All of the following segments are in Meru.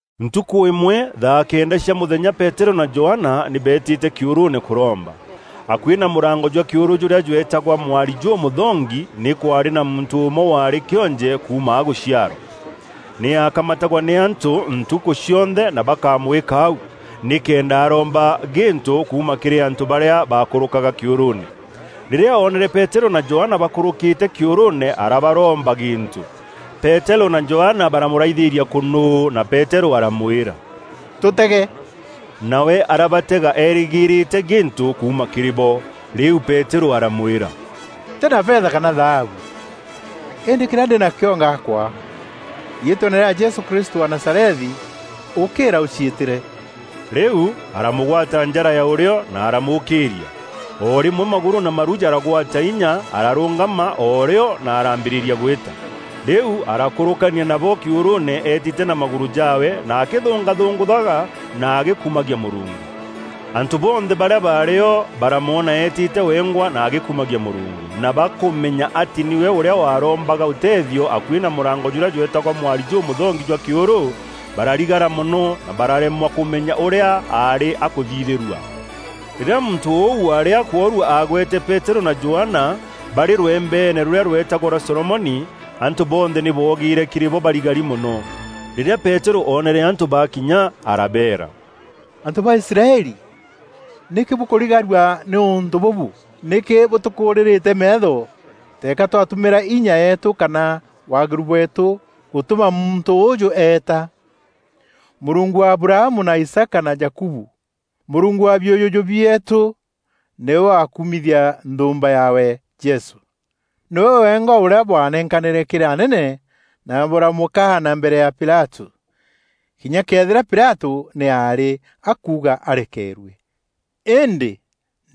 Ntukû îmwe, thaa kenda cia mûthenya, Peterû na Johana nî beetîte kîûrûûne kûromba. Akuî na mûrango jwa kîûrû jûrîa jweetagwa “Mwari jûmûthongi,” nî kwaarî na muntû ûmwe, waarî kîonje kuuma agûciarwa. Nî aakamatagwa nî antû ntukû cionthe na bakamwîka au, nîkenda aroomba gîntû kuuma kîrî antû barîa baakûrûkaga kîûrûûne. Rîrîa oonere Peterû na Johana bakûrûkîte kîûrûûne, arabaroomba gîntû. Peterû na Johana baramûraithîria kûnûû na Peterû aramwîra, “Tûtege!” Nawe arabatega erîgîrîte gîntû kuuma kîrî bo. Rîu Peterû aramwîra, “Ntî na fetha kana thaabu, îndî kîrîa ndî nakîo ngakûa. Riîtweene rîa Jesû Kristû wa Nazarethi, ûkîîra ûciîtîre!” Rîu aramûgwata njara ya ûrîo na aramûûkîîria. O rîmwe magûrû na maru jaragwata inya; ararûngama o rîo na araambîrîria gwîta. Rîu arakûrûkania nabo kîûrûûne eetîte na magûrû jaawe na akîthûngathûngûthaga na agîkumagia Mûrungu. Antû bonthe barîa baarî o, baramwona eetîte wengwa na agîkumagia Mûrungu, na bakûmenya atî nîwe ûrîa warombaga ûteethio akuî na mûrango jûrîa jweetagwa Mwari jûmûthongi jwa kîûrû, bararigara mono na bararemwa kûmenya ûrîa aarî akûthithîrua. Rîrîa muntû ûu waarî akwoorua aagwete Peterû na Johana, barî rwembeene rûrîa rweetagwa rwa Solomoni, antû bonthe nî boogîîre kîrî bo barigari mono. Rîrîa Peterû oonere antû bakinya arabeera, “Antû ba Israeli, nîkî bûkûrigarua nî ûntû bûbû? Nîkî bûtûkûrîrîte meetho teeka twatumîra inya yeetû kana waagîru bweetû gûtûma muntû ûûjû eeta? Mûrungu wa Abrahamu na Isaaka na Jakubu, Mûrungu wa biûjûjû bieetû, nîwe wakumithia nthûûmba yaawe, Jesû. Nîwe wengwa ûrîa bwanenkanîre kîrî anene na bûramûkaana mbere ya Pilatû, kinya këethîra Pilatû nî aarî akuuga arekeerue. Îndî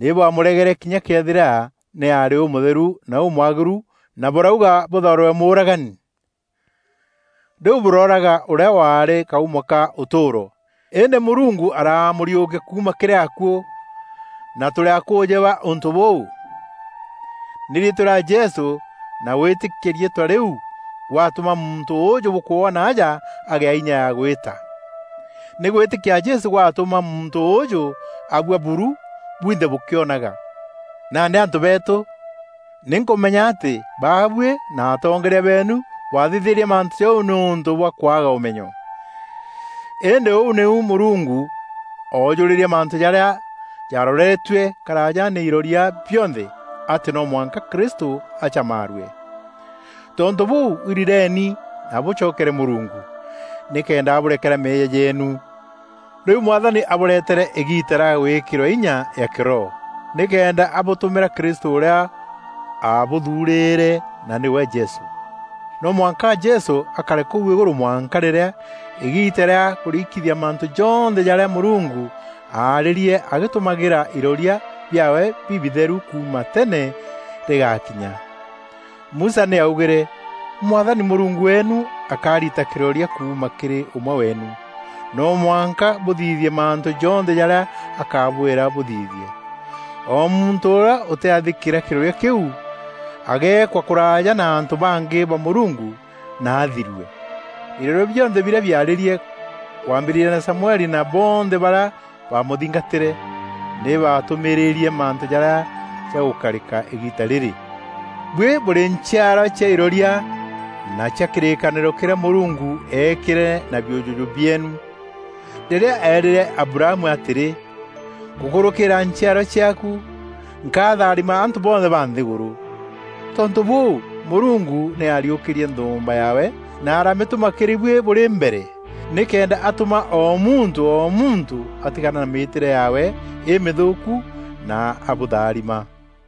nî bwamûregere kinya këethîra nî aarî Ûmûtheru na Ûmwagîru na bûrauga bûthaûrîrwe mûûragani. Rîu bûrooraga Ûrîa waarî kaumo ka ûtûûro. Îndî Mûrungu aramûriûkia kuuma kîrî akuû, na tûrî akûûjî ba ûntû bûu. Nî riîtwa rîa Jesû, na gwîtîkia riîtwa rîu, gwatûma muntû ûûjû bûkwona aja agîa inya ya gwîta. Nî gwîtîkia Jesû gwatûma muntû ûûjû abua buru bwinthe bûkîonaga. “Nandî antû beetû, nî nkûmenya atî baabuî na atongeeria beenu bwathithîrie mantû jau nîûntû bwa kwaaga ûmenyo. Îndî ûu nîu Mûrungu oojûrîrie mantû jarîa jaaroretue karaaja nî iroria bionthe, atî no mwanka Kristû acamaarue. Tontû bûû, irireeni na bûcokere Mûrungu, nîkenda abûrekera meeyia jeenu, rîu Mwathani abûreetîra îgiita rîa gwîkîrwa inya ya kîroho, nîkenda abûtûmîra Krîstû ûrîa aabûthuurîre, na nîwe Jesû. No mwanka Jesû akare kûu îgûrû mwanka rîrîa îgiita rîa kûrikithia mantû jonthe jarîa Mûrungu aarîrie agîtumagîra iroria biaawe bibitheru kuuma tene rîgaakinya. Musa nî aaugîre, ‘Mwathani Mûrungu weenu akarita kîroria kuuma kîrî ûmwe weenu. No mwanka bûthithie mantû jonthe jarîa akabwîra bûthithie. O muntû ûrîa ûtîathîkîîra kîroria kîu, ageekwa kûraaja na antû bangî ba Mûrungu na athirue.’ Iroria bionthe birîa biarîrie, kwambîrîria na Samueli na bonthe barîa baamûthingatîre, nî baatûmîîrîrie mantû jarîa jagûkarîka îgiita rîrî. Bûi bûrî nchiarwa cia iroria na cia kîrîkanîro kîrîa Mûrungu eekîre na biûjûjû bieenu, rîrîa eerîre Abrahamu atîrî, ‘Gûkûrûkîra nchiarwa ciaaku, nkatharima antû bonthe ba nthîgûrû.’ Tontû bûû, Mûrungu nî aariûkîrie nthûûmba yaawe, na aramîtûma kîrî buî bûrî mbere, nîkenda atûma o muntû o muntû atigana na mîîtîre yaawe îmîthûûku na abûtharima.”